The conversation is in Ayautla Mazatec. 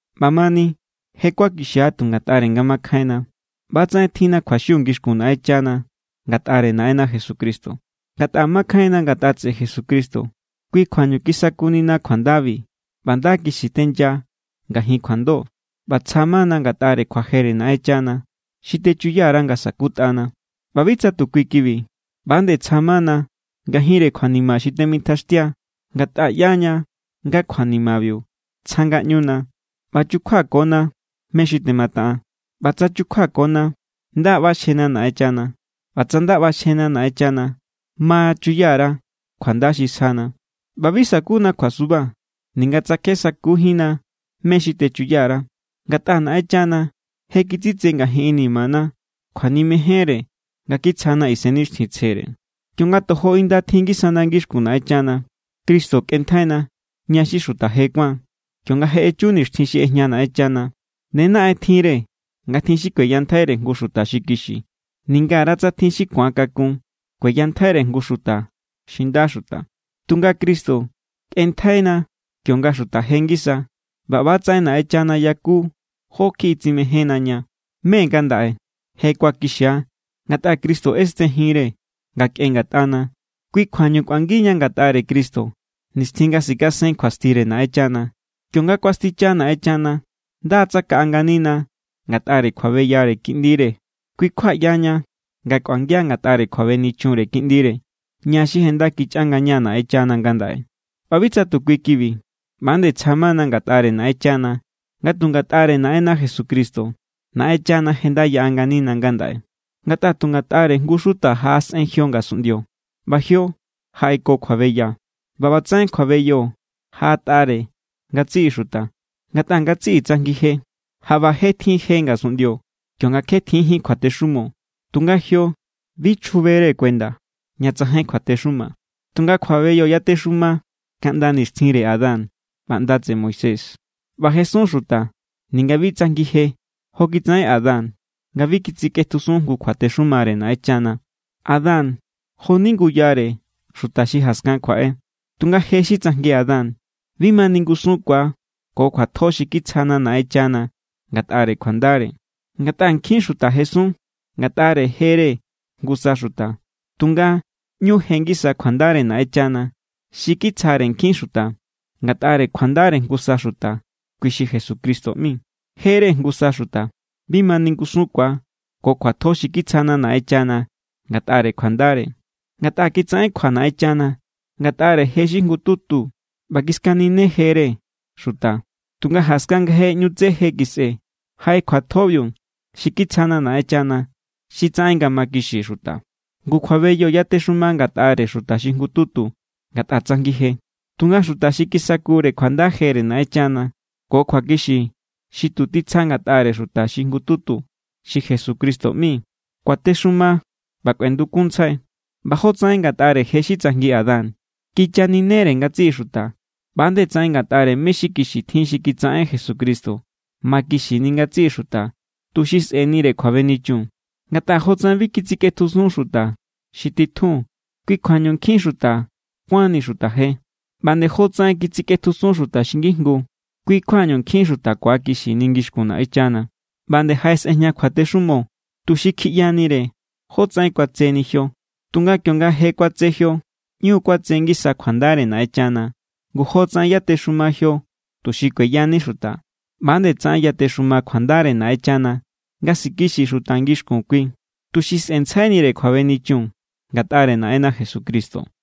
ꞌBamani je= kuakixia tu ngatꞌare nga makjainna. ꞌBatsaꞌen tjinna kjuaxiu ngixkun Naꞌenchana ngatꞌare Naꞌenna Jesucristo. Ngatꞌa makjainna ngatꞌa tseꞌe Jesucristo, kui kjuañu kisakunina kjuandabi ꞌba nda kixi tenya ngajin kjuando ꞌba tsja= mana ngatꞌare kjuajere Naꞌenchana xi techuya_ra nga sa̱kutꞌana. ꞌBa bi tsa tu kui kibi. ꞌBa=nde tsja= mana ngajinre kjuanima xi temitjaxtia, ngatꞌa ꞌyaña nga kjuanimabiu tsja ngaꞌñuna ꞌba chukjuakona mé xi temataꞌan. ꞌBa tsa chukjuakona, nda= ꞌbaxjena Naꞌenchana. ꞌBa tsa nda ꞌbaxjena Naꞌenchana, ma chuya_ra kjuanda xi sjana. ꞌBa bi sakuna kjuasuba, ninga tsa kje sakujínna mé= xi techuya_ra. Ngatꞌa Naꞌenchana je kitsitse ngajin inimana kjuanimejenre nga kitsjana Isennixtjintsjere. Kionga tojo inda tjin ngisana ngixkun Naꞌenchana, Cristo kꞌenntjaina, ña xi xuta je kuáan, kionga je echu nixtjin xi ꞌejña Naꞌenchana. Ne naꞌen tjinre nga tjin xi kueyantjaire jngu xuta xi kixi. Ningara tsa tjin xi ku̱akakun kueyantjaire jngu xuta xi nda xuta. Tunga Cristo, kꞌenntjaina kionga xuta je ngisa. ꞌBa ꞌba=tsaꞌen Naꞌenchana yaku jó kjiꞌi tsimejénna ña. Me ngandaꞌe je kuakixia ngatꞌa Cristo ꞌesten jinre nga kꞌen ngatꞌana. Kui= kjuañu kꞌuangiña ngatꞌare Cristo nixtjin nga sikasen kjuastire Naꞌenchana. Kionga kuasticha Naꞌenchana, nda= tsakaꞌa nganina ngatꞌare kjuabeyare Kiꞌndire. Kui= kjua ꞌyaña nga kꞌuangia ngatꞌare kjuabenichunre Kiꞌndire, ña xi je nda= kichꞌa ngaña Naꞌenchana ngandaꞌe. ꞌBa bi tsa tu kui kibi. ꞌBa=nde tsja mana ngatꞌare Naꞌenchana, ngatꞌa tu ngatꞌare Naꞌenna Jesucristo Naꞌenchana je nda yaꞌa nganina ngandaꞌe. Ngatꞌa tu ngatꞌare jngu= xuta jaꞌasꞌen jio ngasunꞌndio, ꞌba jio jaꞌeko kjuabeya. ꞌBa ꞌbatsaꞌen kjuabeyo jaꞌatꞌare ngatsiꞌi xuta, ngatꞌa ngatsiꞌi tsajngi je. Jaꞌba je tjin je ngasunꞌndio kionga kjetjinjín kjuatexumo, tunga jio bi chjubere kuenda ña tsajain kjuatexuma. Tunga kjuabeyo yatexuma kaꞌnda nixtjinre Adán ꞌba ꞌnda tseꞌe Moisés, ꞌba jesun xuta ninga bi tsajngi je jo kitsaꞌen Adán nga bi kitsikꞌetjusun jngu kjuatexumare Naꞌenchana. Adán jo=ni nguyare xuta xi jaskan kjuaꞌe. Tunga je xi tsajngi Adán bi ma ningusunkua ko kjuatjo xi kitsjana Naꞌenchana ngatꞌare kjuandare. Ngatꞌa nkjin xuta jesun ngatꞌare jere jngusa xuta, tunga ꞌñu je ngisa kjuandare Naꞌenchana xi kitsjare nkjin xuta ngatꞌare kjuandare jngusa xuta, kui xi Jesucristo ꞌmi. Jere jngusa xuta bi ma ningusunkua ko kjuatjo xi kitsjana Naꞌenchana ngatꞌare kjuandare. Ngatꞌa kitsaꞌen kjua Naꞌenchana ngatꞌare je xi jngututu ꞌba kiskaninejere xuta, tunga jaskan nga je ꞌñu tse je kisꞌe, jaꞌe kjuatjobiu xi kitsjana Naꞌenchana xi tsaꞌen nga makixi xuta. Ngu kjuabeyo yatexuma ngatꞌare xuta xi jngututu, ngatꞌa tsajngi je. Tunga xuta xi tisakure kjuanda jere Naꞌenchana ko kjuakixi xi tu titsja ngatꞌare xuta xi jngututu xi Jesucristo ꞌmi kuatexuma ꞌba kꞌuendukunntsjai. ꞌBa jotsaꞌen ngatꞌare je xi tsajngi Adán kichaninere ngatsiꞌi xuta, ꞌba nde tsaꞌen ngatꞌare mé= xi kixi tjin xi kitsaꞌen Jesucristo makixini ngatsiꞌi xuta tuxi sꞌe̱nire kjuabenichun. Ngatꞌa jotsaꞌen bi kitsikꞌetjusun xuta xi titjun kui kjuañu nkjin xuta kuánni xuta je, ꞌba nde jotsaꞌen kitsikꞌetjusun xuta xi ngijngu kui= kjuañu nkjin xuta ku̱akixini ngixkun Naꞌenchana. ꞌBa nde jaꞌesꞌejña kjuatexumo, tuxi kjiꞌyanire jotsaꞌen kuatseni jio. Tunga kionga je kuatse jio, ꞌñu kuatse ngisa kjuandare Naꞌenchana. Ngu jotsaꞌen yatexuma jio tuxi kueyani xuta, ꞌba=nde tsaꞌen yatexuma kjuandare Naꞌenchana nga sikixi xuta ngixkun kui, tuxi sꞌe̱ntsjainire kjuabenichun ngatꞌare Naꞌenna Jesucristo.